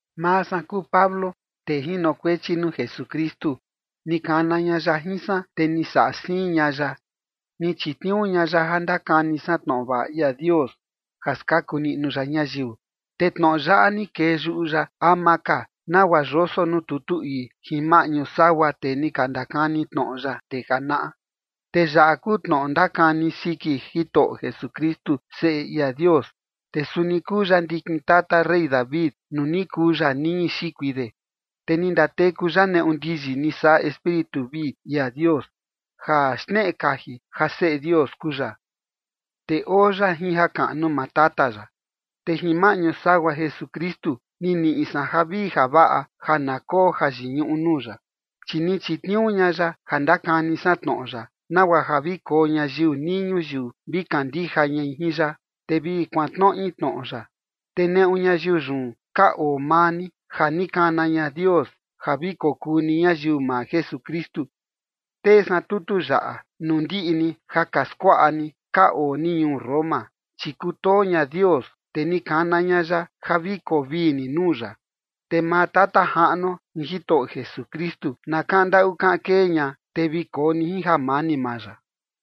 Maa san kuu Pablo, tee jinokuechi nuu Jesukristu. Ni kana ña ya jin san, te ni saꞌa siin ña ya, ni chitniuu ña ya ja ndakani san tnoꞌo vaꞌa ia Dios ja skaku niꞌnu ya ñayiu. Te tnoꞌo yaꞌa ni kee yuꞌu ya ama ka nagua yoso nuu tutu ii jin maꞌñu sagua tee ni ka ndakani tnoꞌo ya ndee janaꞌa. Te yaꞌa kuu tnoꞌo ndakani siki Jitoꞌo Jesukristu, Seꞌe ia Dios. Te suni kuu ya ndikin tata rey David nuu ni kuu ya niñi xikui de. Te ni ndateku ya neꞌu ndiyi ni saꞌa Espíritu vii ia Dios, ja xneꞌe kaji ja Seꞌe Dios kuu ya, te oo ya jin jakaꞌnu maa Tata ya. Te jin maꞌñu sagua Jesukristu, ni niꞌi san javii javaꞌa ja na koo jayiñuꞌu nuu ya, chi ni chitniuu ña ya ja ndakani san tnoꞌo ya, nagua ja vi koo ñayiu nii ñuyiu vi kandija ñai jin ya, te vi kuantnoꞌi tnoꞌo ya. Te neꞌu ñayiu yun ka oo maa ni, ja ni kana ña Dios ja vi kokuu ni ñayiu maa Jesukristu. Tee san tutu yaꞌa nuu ndiꞌi ni ja ka skuaꞌa ni ka oo ni ñuu Roma, chi kutoo ña Dios, te ni kana ña ya ja vi koo vii ni nuu ya. Te maa Tata Jaꞌnuo jin Jitoꞌo Jesukristu na kaꞌan ndaꞌu kaꞌan kee ña, te vi koo ni jin jamani maa ya.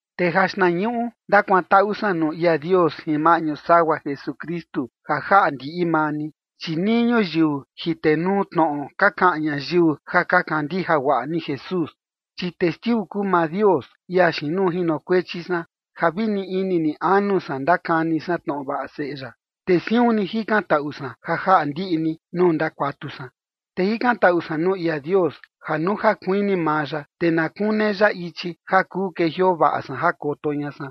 Te jaxtnañuꞌu ndakuantaꞌu san nuu ia Dios jin maꞌñu sagua Jesukristu, ja jaꞌa ndiꞌi maa ni, chi nii ñuyiu jitenuu tnoꞌo, ka kaꞌan ñayiu ja ka kandija guaꞌa ni Jesús. Chi testiu kuu maa Dios, ia xiin nuu jinokuechi san, ja vi ni ini ni anu san ndakani san tnoꞌo vaꞌa Seꞌe ya, te siun ni jikantaꞌu san ja jaꞌa ndiꞌi ni nuu ndakuatu san. Te jikantaꞌu san nuu ia Dios ja nuu ja kuini maa ya, te na kune ya ichi ja kuu kejioo vaꞌa san jakoto ña san.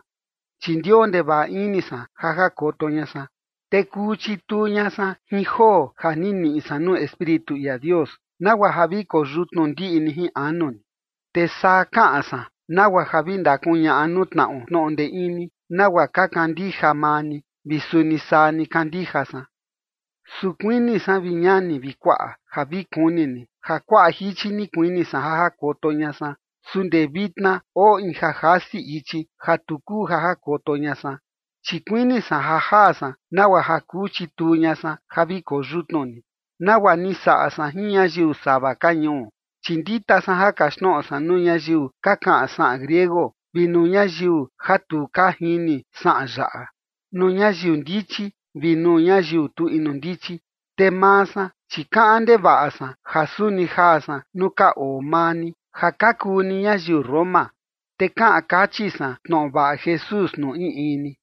Chi ndioo ndevaꞌa ini san ja jakoto ña san, te kuu chituu ña san jin joo ja ni niꞌi san nuu Espíritu ia Dios, nagua ja vi koo yutnu ndiꞌi ni jin anu ni. Te saa kaꞌan san, nagua ja vi ndakuñaꞌa nuu tnaꞌo tnoꞌo ndee ini, nagua ka kandija maa ni, vi suni saa ni kandija san. Su kuini san, vi ñani vi kuaꞌa, ja vi kuni ni ja kuaꞌa jichi ni kuini san ja jakoto ña san. Su ndee vitna oo in ja jasi ichi ja tu kuu ja jakoto ña san. Chi kuini san ja jaa san nagua ja kuu chituu ña san ja vi koo yutnu ni, nagua ni saꞌa san jin ñayiu sava ka ñuu. Chi ndita san ja kaxtnoꞌo san nuu ñayiu ka kaꞌan saꞌan griego vi nuu ñayiu ja tu ka jini saꞌan yaꞌa, nuu ñayiu ndichi vi nuu ñayiu tu inu ndichi. Te maa san, chi kaꞌan ndevaꞌa san, ja suni jaa san nuu ka oo maa ni, ja ka kuu ni ñayiu Roma, te kaꞌan kachi san tnoꞌo vaꞌa Jesús nuu in in ni.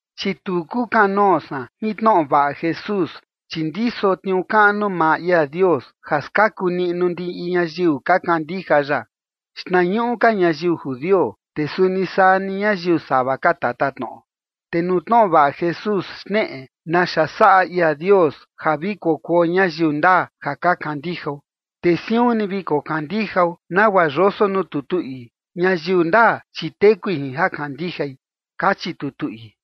Chi tu kukanoo san jin tnoꞌo vaꞌa Jesús, chi ndiso tniuu kaꞌnu maa ia Dios, ja skaku niꞌnu ndiꞌi ñayiu ka kandija ya, xtnañuꞌu ka ñayiu judio, te suni saa ni ñayiu sava ka tatatnoꞌo. Te nuu tnoꞌo vaꞌa Jesús xneꞌe naxa saꞌa ia Dios ja vi kokuo ñayiu ndaa ja ka kandijao, te siun ni vi kokandijao, nagua yoso nuu tutu ii: “Ñayiu ndaa, chi tekui jin ja kandijai” kachi tutu ii.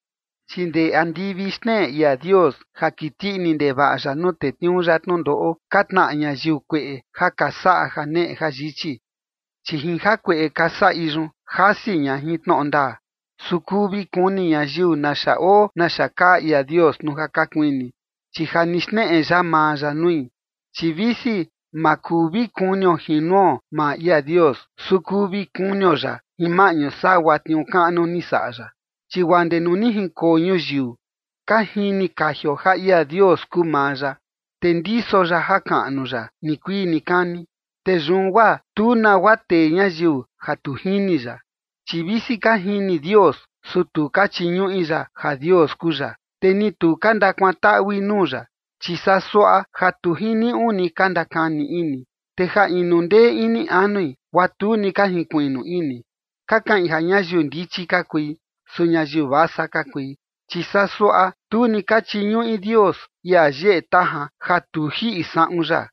Chi ndee andivi xneꞌe ia Dios ja kiti ini ndevaꞌa ya nuu tetniuu ya tnundoꞌo ka tnaꞌa ñayiu kueꞌe ja ka saꞌa janeꞌe jayichi, chi jin jakueꞌe ka saꞌi yun, jasi ña jin tnoꞌo ndaa. Su kuu vi kuni ñayiu naxa oo naxa kaa ia Dios nuu ja ka kuini, chi ja ni xneꞌe ya maa ya nui. Chi visi ma kuu vi kunio jin nuo maa ia Dios, su kuu vi kunio ya jin maꞌñu sagua tniuu kaꞌnu ni saꞌa ya. Chi guaa ndee nuu ni jinkoo ñuyiu, ka jini kajio ja ia Dios kuu maa ya, te ndiso ya jakaꞌnu ya nikuii nikani. Te yun guaa tu nagua tee ñayiu ja tu jini ya. Chi visi ka jini Dios, su tu ka chiñuꞌi ya ja Dios kuu ya, ni tu ka ndakuantaꞌui nuu ya. Chi saa suaꞌa ja tu jiniuꞌu ni ka ndakani ini, te ja inu ndee ini anui, guaa tu ni ka jinkuiꞌnu ini. Ka kaꞌin ja ñayiu ndichi ka kui, su ñayiu vasa ka kui. Chi saa suaꞌa, tu ni ka chiñuꞌi Dios, ia yeꞌe tajan ja tu jiꞌi saꞌun ya,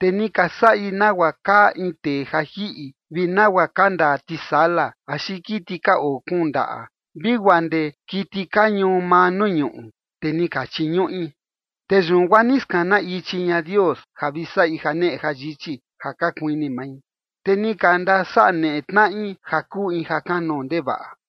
te ni ka saꞌi nagua kaa in tee ja jiꞌi vi nagua ka ndaa tisala, axi kiti ka oo kuun ndaꞌa vi guaa ndee kiti ka ñuu maa nuu ñuꞌu, te ni ka chiñuꞌi. Te yun guaa ni skana ichi ña Dios, ja vi saꞌi janeꞌe jayichi ja ka kuini mai, te ni ka ndasaneꞌe tnaꞌi ja kuu in ja kanoo ndevaꞌa.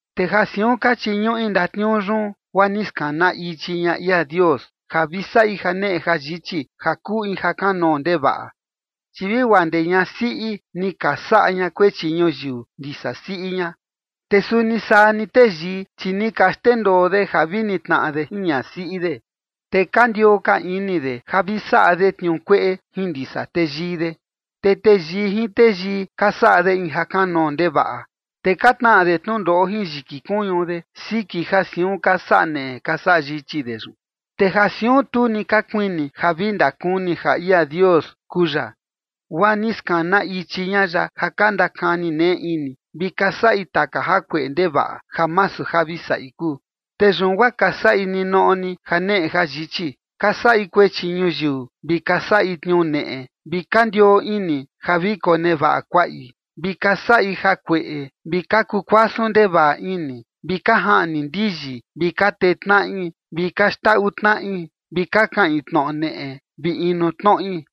Te ja siun ka chiñuꞌi ndatniuu yun, guaa ni skana ichi ña ia Dios ja vi saꞌi janeꞌe jayichi ja kuu in ja kanoo ndevaꞌa. Chi vi guaa ndee ñasiꞌi ni ka saꞌa ña kuechi ñuyiu ndisa siꞌi ña. Te suni saa ni teyii, chi ni ka xndendoo de ja vi nitnaꞌa de jin ñasiꞌi de, te ka ndioo ka ini de ja vi saꞌa de tniuu kueꞌe jin ndisa teyii de. Te teyii jin teyii ka saꞌa de in ja kanoo ndevaꞌa, te ka tnaꞌa de tnundoꞌo jin yiki kuñu de siki ja siun ka saꞌa neꞌe ka saꞌa yichi de yun. Te ja siun tu ni ka kuini ja vi ndakuni ja ia Dios kuu ya, guaa ni skana ichi ña ya ja ka ndakani neꞌe ini, vi ka saꞌi taka jakueꞌe ndevaꞌa ja masu ja vi saꞌi kuu. Te yun guaa ka saꞌi ninoꞌo ni janeꞌe jayichi: ka saꞌi kuechi ñuyiu, vi ka saꞌi tniuu neꞌe, vi ka ndioo ini ja vi konevaꞌa kuaꞌi, vi ka saꞌi jakueꞌe, vi ka kuu kuasun ndevaꞌa ini, vi ka jaꞌni ndiyi, vi ka tee tnaꞌi, vi ka xndaꞌu tnaꞌi, vi ka kaꞌin tnoꞌo neꞌe vi inu tnoꞌi.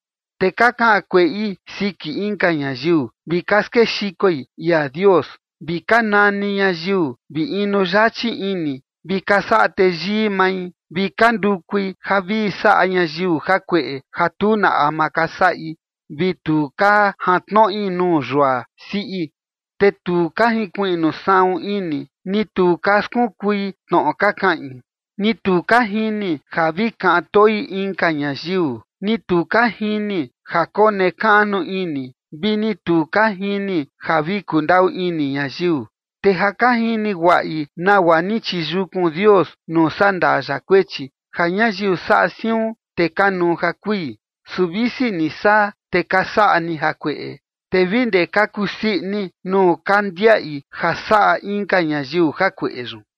Te ka kaꞌan kueꞌi siki inka ñayiu, vi ka skexikoi ia Dios, vi ka nani ñayiu, vi inu yachi ini, vi ka saꞌa teyii mai, vi ka ndukui ja vi saꞌa ñayiu jakueꞌe ja tu na ama ka saꞌi vi tu ka jantnoꞌi nuu yua siꞌi. Te tu ka jinkuiꞌnu saꞌun ini, ni tu ka skunkui tnoꞌo ka kaꞌin, ni tu ka jini ja vi kaꞌan toi inka ñayiu, ni tu ka jini ja konekaꞌnu ini, vi ni tu ka jini ja vi kundaꞌu ini ñayiu. Te ja ka jini guaꞌi nagua ni chiyukun Dios nuu sandaa ya kuechi, ja ñayiu saꞌa siun, te kanuu ja kui. Su visi ni saa, te ka saꞌa ni jakueꞌe, te vi ndee ka kusii ini nuu ka ndiaꞌi ja saꞌa inka ñayiu jakueꞌe yun.